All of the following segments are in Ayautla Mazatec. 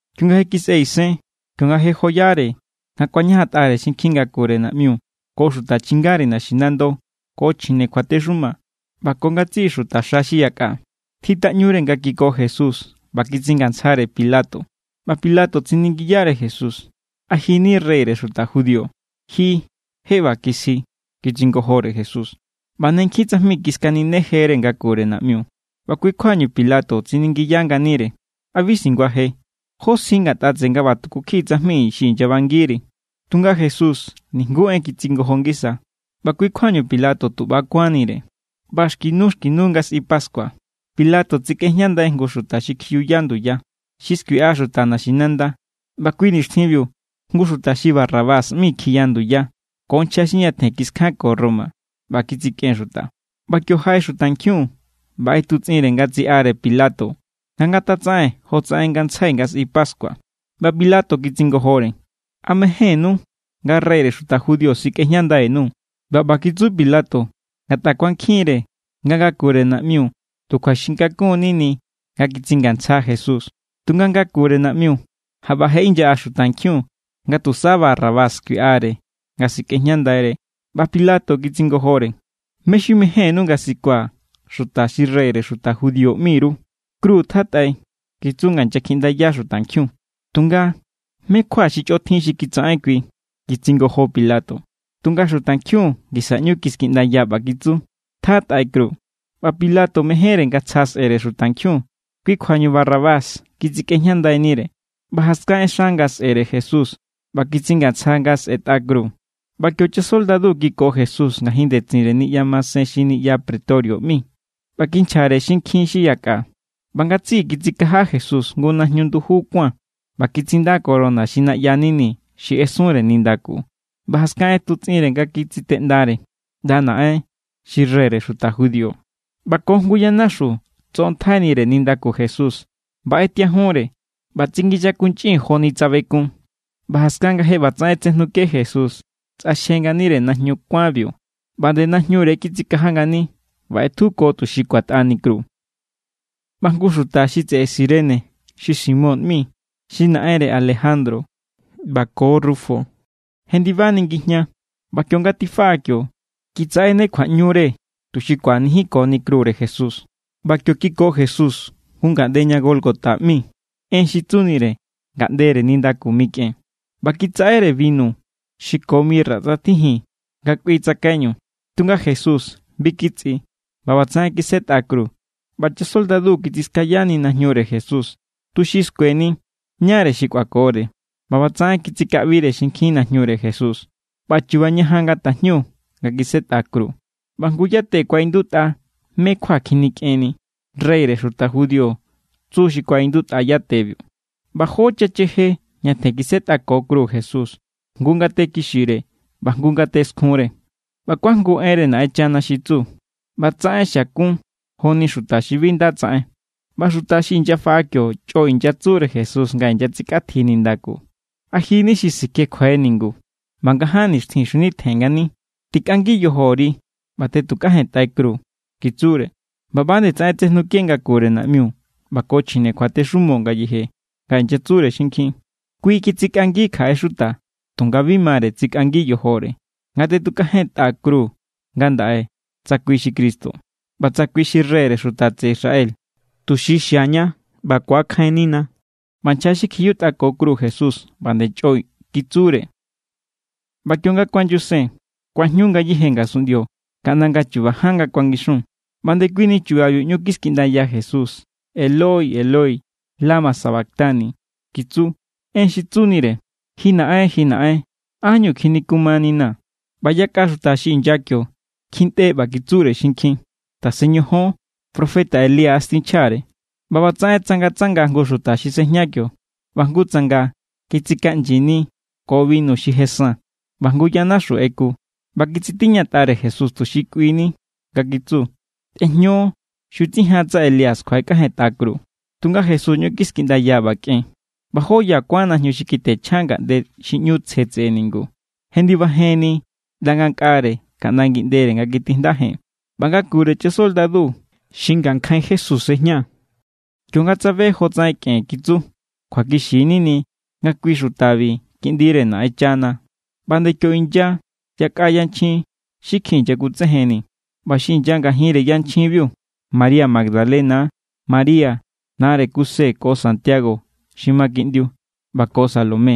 Kionga je kisꞌe isen, kionga je joyare nga kuañajantꞌare xinkjin ngakure naꞌmiu ko xuta chingare naxinando, ko chjine kjuatexuma ꞌba ko ngatsiꞌi xuta xa xi yakꞌa, tjitaꞌñure nga kiko Jesús ꞌba kitsingantsjare Pilato. ꞌBa Pilato tsiningiyare Jesús: —¿A ji= ni reyre xuta judío? —Ji je ꞌba kisji —kitsingojore Jesús. ꞌBa ne nkjin tsajmi kiskaninejere ngakure naꞌmiu. ꞌBa kui= kjuañu Pilato tsiningiya nganire: —¿A bi singuaje? ¿Jó sji ngatꞌa tseꞌe nga ꞌba tuku kjiꞌi tsajmi xi inyabangiri? Tunga Jesús nijnguú en kitsingojo ngisa; ꞌba kui= kjuañu Pilato tu ꞌba= kuánnire. ꞌBa xki nu xki nu nga sꞌi pascua, Pilato tsikꞌejñandai jngu xuta xi kjiyuya nduya, xi skuiꞌa xuta naxinanda. ꞌBa kui nixtjinbiu jngu xuta xi Barrabás ꞌmi kjiya nduya ko nchja xi ñatjen kiskjanko Roma ꞌba kitsikꞌen xuta. ꞌBa kio jaꞌe xutankjiun ꞌba ꞌetutsꞌinre nga tsiꞌare Pilato nga ngatatsaꞌen jotsaꞌen ngantsjai nga sꞌi pascua. ꞌBa Pilato kitsingojore: —¿A mejénnú nga reyre xuta judío sikꞌejñandai_nuu̱? ꞌBa ꞌba kitsu Pilato ngatꞌa kuankjinre nga ngakure naꞌmiu tu kjuaxin kakun= nini nga kitsingantsja Jesús. Tunga ngakure naꞌmiu jaꞌba je inyaꞌa xutankjiun nga tusa Barrabás skuiꞌare nga sikꞌejñandaire. ꞌBa Pilato kitsingojore: —¿Mé= xi mejénnú nga sikua̱ xuta xi reyre xuta judío ꞌmi_ru? —¡Kru tjatꞌai! —kitsu nga inyakjiꞌndaya xutankjiun. —Tunga ¿mé= kjua xi chꞌotjin xi kitsaꞌen kui? —kitsingojo Pilato. Tunga xutankjiun ngisa ꞌñu kiskiꞌndaya ꞌba kitsu: —¡Tjatꞌai kru! ꞌBa Pilato mejénre nga tsja sꞌere xutankjiun, kui= kjuañu Barrabás kitsikꞌejñandainire; ꞌba jaskan ꞌexa nga sꞌe̱re Jesús ꞌba kitsingantsja nga se̱tꞌa kru. ꞌBa kio chasoldadu kiko Jesús ngajin ndetsinre niꞌya masen xi niꞌya pretorio ꞌmi, ꞌba kinchjare xinkjin xi yakꞌa. ꞌBa ngatsiꞌi kitsikaja Jesús jngu najñu nduju kuán, ꞌba kitsinda corona xi naꞌya nini xi ꞌesunre nindaku. ꞌBa jaskan ꞌetutsꞌinre nga kitsiteꞌndare: —¡ꞌNda naꞌen, xi reyre xuta judío! ꞌBa ko jngu yanaxu tsoꞌontjainire nindaku Jesús, ꞌba ꞌetiajunre ꞌba tsikinyakuꞌnchin joni tsa bekun. ꞌBa jaskan nga je ꞌbatsaꞌen tsejnuke Jesús, tsꞌaxje nganire najñu kuánbiu ꞌba nde najñure= kitsikaja ngani. ꞌBa ꞌetjuko tuxi kuatꞌani kru. ꞌBa jngu xuta xi tseꞌe Sirene xi Simón ꞌmi, xi naꞌenre Alejandro ko Rufo, jendibani ngijña; ꞌba kionga tifaꞌa kio, kitsaꞌene kjuaꞌñure tuxi kꞌuanijinkoni krure Jesús. ꞌBa kio kiko Jesús jngu ngaꞌnde ña Gólgota ꞌmi. (En xi tsunire: ngaꞌndere nindaku mikꞌen.) ꞌBa kitsaꞌere binu xi ko mirra tsꞌatjijin nga kꞌui tsakaiñu, tunga Jesús bi kitsꞌi. ꞌBa ꞌbatsaꞌen kisetꞌa kru. ꞌBa chasoldadu kitsiskayani najñure Jesús, tuxi skueni ñáre xi kꞌuakore. ꞌBa ꞌbatsaꞌen kitsikaꞌbire xinkjin najñure Jesús. ꞌBa chu̱ba̱ ñajan nga tajñu nga kisetꞌa kru. ꞌBa jngu yate kuaꞌindutꞌa mé= kjua kjinikꞌenni. “Reyre xuta judío” tsu xi kuaꞌindutꞌa yatebiu. ꞌBa jó chacheje ñatjen kisetꞌako kru Jesús, jngu ngate kixire ꞌba jngu ngate skjunre. ꞌBa kuajngu enre Naꞌenchana xi tsu: “ꞌBatsaꞌen xiakun joni xuta xi bi nda tsaꞌen.” ꞌBa xuta xi inyafaꞌa kio chꞌo inyatsure Jesús nga inyatsikꞌatji nindaku: —¿A ji= ni xi sikjekjue ningu ꞌba nga ján nixtjin xjunitjen ngani? Tikꞌangi yojori ꞌba tꞌetukajentꞌai kru —kitsure. ꞌBa ꞌba=nde tsaꞌen tsejnuke ngakure naꞌmiu ꞌba ko chjine kjuatexumo ngayeje, nga inyatsure xinkjin: —Kui kitsikꞌangi kjaꞌe xuta, tunga bi mare tsikꞌangi yojore. Ngatꞌetukajentꞌa kru ngandaꞌe tsa kui xi Cristo, ꞌba tsa kui xi reyre xuta tseꞌe Israel tuxi xiaña ꞌba ku̱akjainnina. ꞌBa nchja xi kjiyutꞌako kru Jesús ꞌba=nde chꞌo kitsure. ꞌBa kionga kuanyusen, kuajñu ngayéje ngasunꞌndio kaꞌnda nga̱ chuba ján nga kuangixun. ꞌBa ndekuini chubabiu ꞌñu kiskiꞌndaya Jesús: —Eloi, Eloi, ¿lama sabactani? —kitsu. (En xi tsunire: Ji Naꞌen, ji Naꞌen, ¿ánñu kjinikumaninaa̱?) ꞌBa yakꞌa xuta xi inya kio, kjintꞌe ꞌba kitsure xinkjin: —Tasen ñojón, profeta Elías tinchjare. ꞌBa ꞌbatsaꞌen tsangatsanga jngu xuta xi sejña kio, ꞌba jngu tsanga kitsikaꞌnyini ko binu xi je san, ꞌba jngu yanaxu ꞌeku ꞌba kitsitiñatꞌare Jesús tuxi kꞌuini, nga kitsu: —Tejño; xutsijan tsa Elías kjuaꞌekꞌajentꞌa kru. Tunga Jesús ꞌñu kiskiꞌndaya, ꞌba kꞌen. ꞌBa jó ya kuán najñu xi kitjenchja ngaꞌnde xi ꞌñu tsje tseꞌe ningu, jendibajenni ꞌnda ngankꞌare kaꞌnda ngiꞌndere nga kitijndajen. ꞌBa ngakure chasoldadu xi ngankjain Jesús sejña, kionga tsabe jotsaꞌen kꞌen, kitsu: —Kjuakixi= nini nga kui xutabi Kiꞌndire Naꞌenchana. ꞌBa=nde kio inya yakꞌa yanchjin xi kjin inyakutsejenni; ꞌba xi inya ngajinre yanchjinbiu María Magdalena=, María nare Kuse ko Santiago xi ma kiꞌndiu, ꞌba ko Salomé.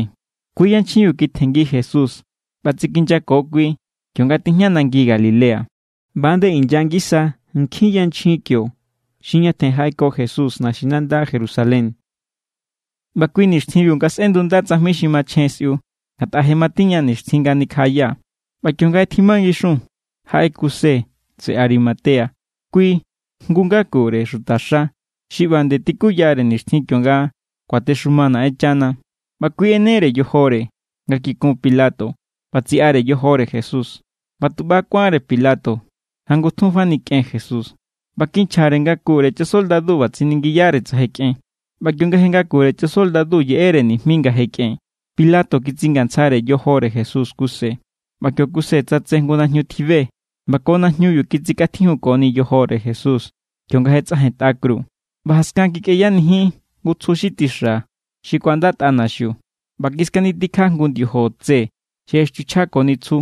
Kui= yanchjinbi kitjenngi Jesús ꞌba tsikinyako kui, kionga tijña nangi Galilea. ꞌBa=nde inya ngisa nkjin yanchjin kio xi ñatjen jaꞌeko Jesús naxinanda Jerusalén. ꞌBa kui nixtjinbiu nga sꞌendunda tsajmi xi machjen sꞌiu, ngatꞌa je matiña nixtjin nga nikjaꞌaya. ꞌBa kionga je tjima ngixun, jaꞌe Kuse tseꞌe Arimatea. Kui= jngu ngakure xuta xa xi ꞌba nde tikuyare nixtjin kionga kuatexuma Naꞌenchana. ꞌBa kui ꞌenere yojore nga kikun Pilato ꞌba tsiꞌare yojore Jesús. ꞌBa tu ꞌba= kuánre Pilato nga ngutjun fani kꞌen Jesús, ꞌba kinchjare ngakure chasoldadu ꞌba tsiningiyare tsa je kꞌen. ꞌBa kionga je ngakure chasoldadu yeꞌere nijmi nga je kꞌen, Pilato kitsingantsjare yojore Jesús Kuse. ꞌBa kio Kuse tsatse jngu najñu tjibe, ꞌba ko najñubiu kitsikꞌatjijunni yojore Jesús kionga je tsꞌajentꞌa kru. ꞌBa jaskan kikꞌeyanijin jngu tsju xi tixa xi kuandatꞌa naxiu, ꞌba kiskanitikja jngu ndiojo tse xi ꞌextiuchjakoni tsju.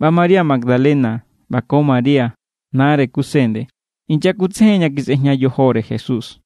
ꞌBa María Magdalena, ꞌba ko María, nare Kuse nde, inyakutsejen ña kisꞌejña yojore Jesús.